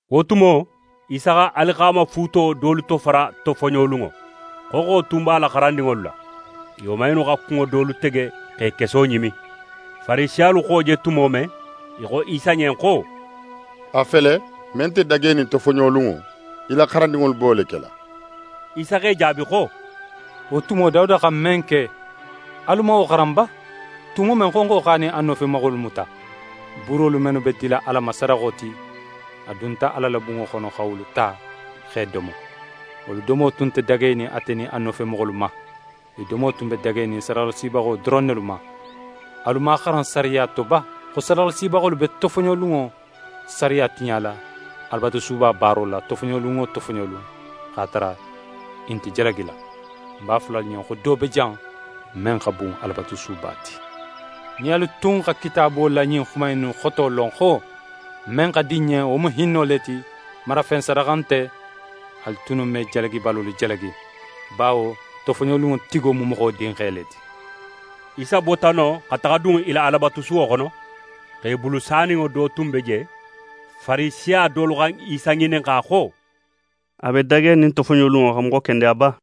Wo tumo, Isa xa alixaamafuuto dolu tofara tofoɲolunŋo. Xonxo tun b'a la xarandinŋolu la, i woman innu xa kunŋo dolu tege, x'e keso ɲimi. Farisiyalu xa wo je tumo men, i xo Isa ɲen xo: «A fele, men nte dagenin tofoɲolunŋo, í la xarandinŋolu be wo kela.» Isa x'e jaabi xo: «Wo tumo Dawuda xa men ke, alu man wo xaran ba, tumo men xonxo x'a nin a nofemoxolu muta? Buurolu mennu be dila Ala ma sadaxo ti, a dunta Ala la bunŋo xono xa wolu ta, x'e domo. Wolu domo tun nte dagenin ate nin a nofemoxolu ma. I domo tun be dagenin sadaxalasibaxolu doron nelu ma. Alu man a xaran sariya to ba xo sadaxalasibaxolu be tofoɲolunŋo sariya tiɲala Alabatusuba baaro la, tofoɲolun wo tofoɲolun, x'a tara i nte jalagila? Ń b'a fola alu ɲen xo do be jan, men xa bun Alabatusuba ti. Nin alu tun xa Kitaabo la ɲin xuma innu xoto lon xo: “Men xa di ń ɲen, wo mu hinno le ti, marafen sadaxa nte”, alu tunnu me jalagibalolu jalagi. Bawo tofoɲolunŋo tigo mu Moxo Dinxe le ti.» Isa bota non xa taxa dun i la Alabatusuwo xono. Xe bulu saninŋo do tun be je. Farisiya dolu xa Isa ŋininxa xo: «A be dagenin tofoɲolunŋo xa moxo kendeya ba?»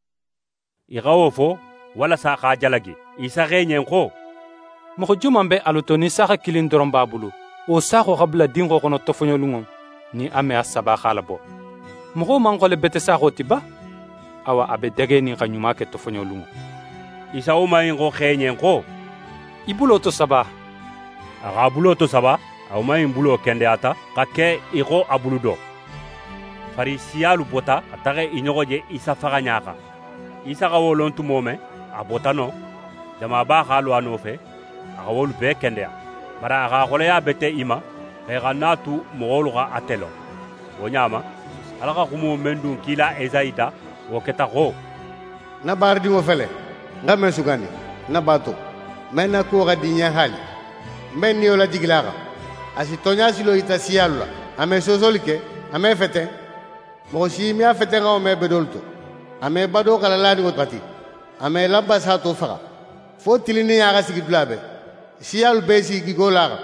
I xa wo fo, walasa x'a jalagi. Isa xo i ɲen xo: «Moxo joman be alu to nin saaxa kilin doron b'a bulu, wo saaxo xa bula dinxo xono tofoɲolunŋo, nin a me a saba x'a labo. Moxo man xole bete saaxo ti ba? Awa, a be dagenin xa ɲuma ke tofoɲolunŋo.» Isa woman in xo xe ɲen xo: «Í bulo tosaba!» A x'a bulo tosaba. A woman in bulo kendeyata xa ke í xo a bulu do. Farisiyalu bota xa taxa i ɲoxo je Isa faxaɲa xan. Isa xa wo lon tumo men, a bota non. Jamaba x'a lo a nofe, a xa wolu bee kendeya. Bari a x'a xoleya bete i ma, xo i xana a tu moxolu xa ate lon. Wo ɲa ma, Ala xa xumo men dun kila Esayi da, wo keta xo: «Ń na baaradinŋo fele, ń xa men sugandi, ń na baato, men na kuwo xa di ń ɲen haali. Ń be ń Niyo lajigila a xan. A si tonɲa silo yita siyalu la. A me soosoli ke, a me feten. Moxo si me a fetenxanŋo me bedolu to. A me badoxala laninŋo xati, a me lanpa sato faxa, fo tilinninɲa xa sigi dula bee. Siyalu bee s'i gigo la a xan.»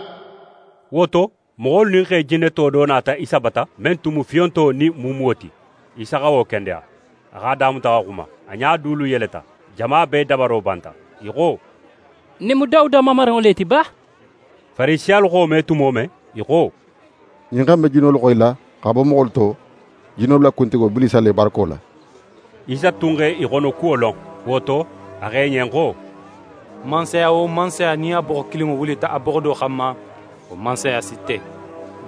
Wo to, moxolu nin xe jinneto do nata Isa bata, men tun mu fiyonto nin muumuwo ti. Isa xa wo kendeya. A x'a damuta xa xuma. A ɲa dulu yeleta. Jama bee dabaro banta. I xo: «Ɲin mu Dawuda Mamarinŋo le ti ba?» Farisiyalu xa wo me tumo men, i xo: «Ɲin xe in be jinnolu xoyila xa bo moxolu to jinnolu la kuntigo Bilisa le barako la.» Isa tun x'e xonokuwo lon; wo to, a xo i ɲen xo: «Mansaya wo mansaya nin a boxo kilinŋo wulita a boxo do xanma, wo mansaya si te.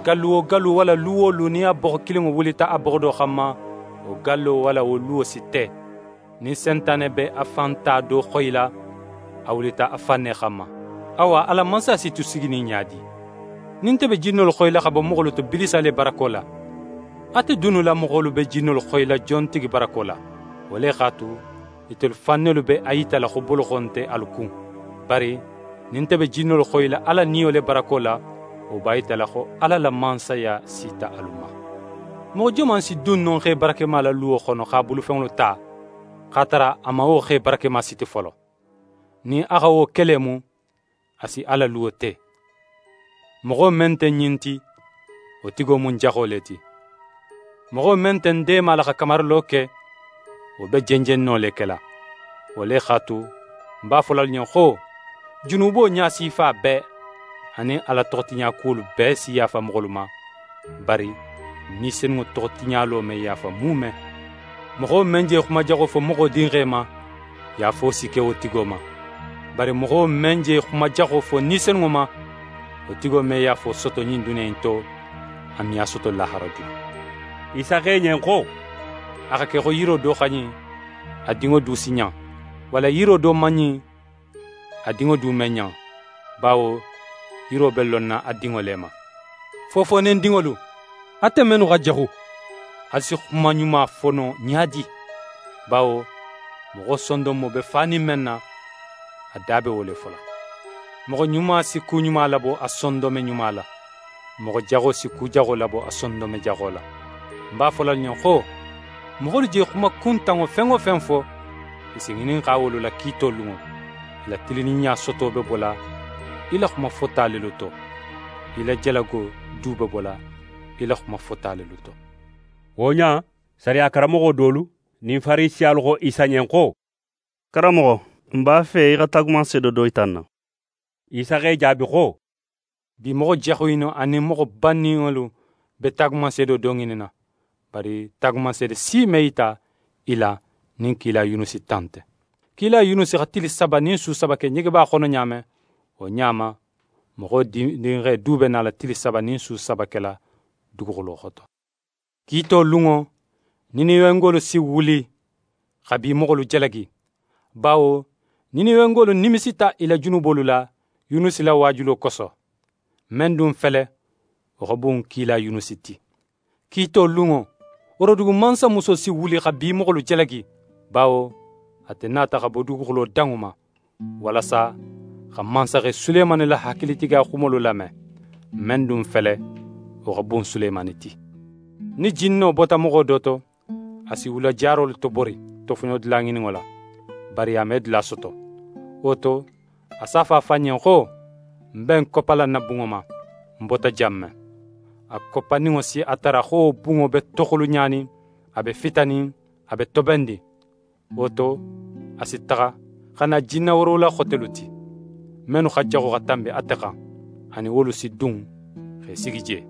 Gallu wo gallu, walla lu wo lu nin a boxo kilinŋo wulita a boxo do xanma, wo gallo walla wo luwo si te. Nin Sentane be a fan ta do xoyila, a wulita a fan ne xanma. Awa, a la mansaya si tu siginin ɲa di? Nin nte be jinnolu xoyila xa bo moxolu to Bilisa le barako la, ate dunnu la moxolu be jinnolu xoyila jontigi barako la? Wo le x'a tu, itelu fan nelu be a yitala xo boloxo nte alu kun. Bari nin nte be jinnolu xoyila Ala Niyo le barako la, wo b'a yitala xo Ala la Mansaya sita alu ma. «Moxo joman si dun no xe barakema la luwo xono x'a bulufenŋolu ta, x'a tara a man wo xe barakema siti folo? Nin a xa wo ke le mu, a si a la luwo te. Moxo men nte ń ɲin ti, wo tigo mu ń jaxo le ti. Moxo men nte ń deemala xa kamarilo ke, wo be jenjenno le kela. Wo le x'a tu, ń b'a fola alu ɲen xo: Junubo ɲasifa bee, anin Ala toxotiɲakuwolu bee si yaafa moxolu ma, bari Ni Senunŋo toxo tiɲalo me yaafa muume. Moxo men je xuma jaxo fo Moxo Dinxe ma, yaafo si ke wo tigo ma, bari moxo men je xuma jaxo fo Ni Senunŋo ma, wo tigo me yaafo soto ɲin duniya in to, a me a soto lahara du.» Isa xo i ɲen xo: «A xa ke xo yiro do xa ɲin, a dinŋo du si ɲan, walla yiro do man ɲin, a dinŋo du me ɲan; bawo yiro be lonna a dinŋo le ma. Fofoonedinŋolu, ate mennu xa jaxu, alu si xuma ɲuma fo no ɲa di? Bawo moxo sondonmo be fanin men na, a da be wo le fola. Moxo ɲuma si ku ɲuma labo a sondonme ɲuma la. Moxo jaxo si ku jaxo labo a sondonme jaxo la. Ń b'a fola alu ɲen xo: Moxolu je xuma kuntanŋo fen wo fen fo, i si ŋininxa wolu la kiito lunŋo. Í la tilinninɲa soto be bola í la xuma fota lelu to, í la jalago du be bola í la xuma fota lelu to.» Wo ɲa in, sariya karanmoxo dolu nin Farisiyalu xo Isa ɲen xo: «Karanmoxo, n b'a fe í xa taagumanseedo do yita n na.» Isa x'e jaabi xo: «Bi moxo jaxu innu anin moxo banninŋolu be taagumanseedo do ŋininna, bari taagumanseede si me yita i la nin kila Yunusi ta nte. Kila Yunusi xa tili saba nin su saba ke ɲegeba xono ɲa men, wo ɲa ma, Moxo Dinxe du be nala tili saba nin su saba kela duguxulo xoto. Kiito lunŋo, Niniwengolu si wuli xa bi moxolu jalagi, bawo Niniwengolu nimisita i la junubolu la Yunusi la waajulo koso. Men dun fele, wo xa bun kila Yunusi ti. Kiito lunŋo, Worodugu mansamuso si wuli xa bi moxolu jalagi; bawo ate nata xa bo duguxulo danŋo ma, walasa xa mansaxe Sulemani la hakilitigiya xumolu lame. Men dun fele, wo xa bun Sulemani ti. «Nin jinno bota moxo do to, a si wula jarolu tobori, tofoɲodula ŋininno la. Bari a me dula soto. Wo to, a s'a fo a fan ɲen xo: “Ń be ń koppala ń na bunŋo ma, ń bota jan men.” A koppaninŋo si a tara xo wo bunŋo be toxulunɲanin, a be fitanin, a be tobennin. Wo to, a si taxa, xa na jinna woorowula xotelu ti, mennu xa jaxu xa tanbi ate xan. A nin wolu si dun x'e sigi je.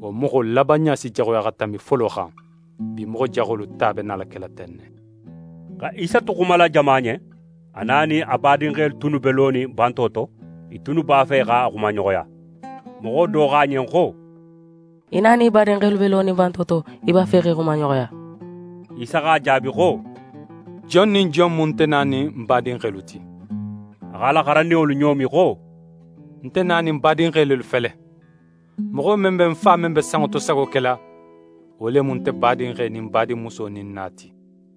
Wo moxo labanɲa si jaxuya xa tanbi folo xan. Bi moxo jaxolu ta be nala kela ten ne.» Xa Isa tu xumala jama ɲen, a na nin a badinxelu tunnu be lonin banto to, i tunnu b'a fe x'a xumaɲoxoya. Moxo do xo a ɲen xo: «Í na nin í badinxelu be lonin banto to, i b'a fe x'e xumaɲoxoya.» Isa x'a jaabi xo: «Jon nin jon mu nte na nin ń badinxelu ti?» A x'a la xarandinŋolu ɲoomi xo: «Nte na nin ń badinxe lelu fele. Moxo men be ń Fa men be sanŋo to sago kela, wo le mu nte badinxe nin ń badinmuso nin ń na ti.»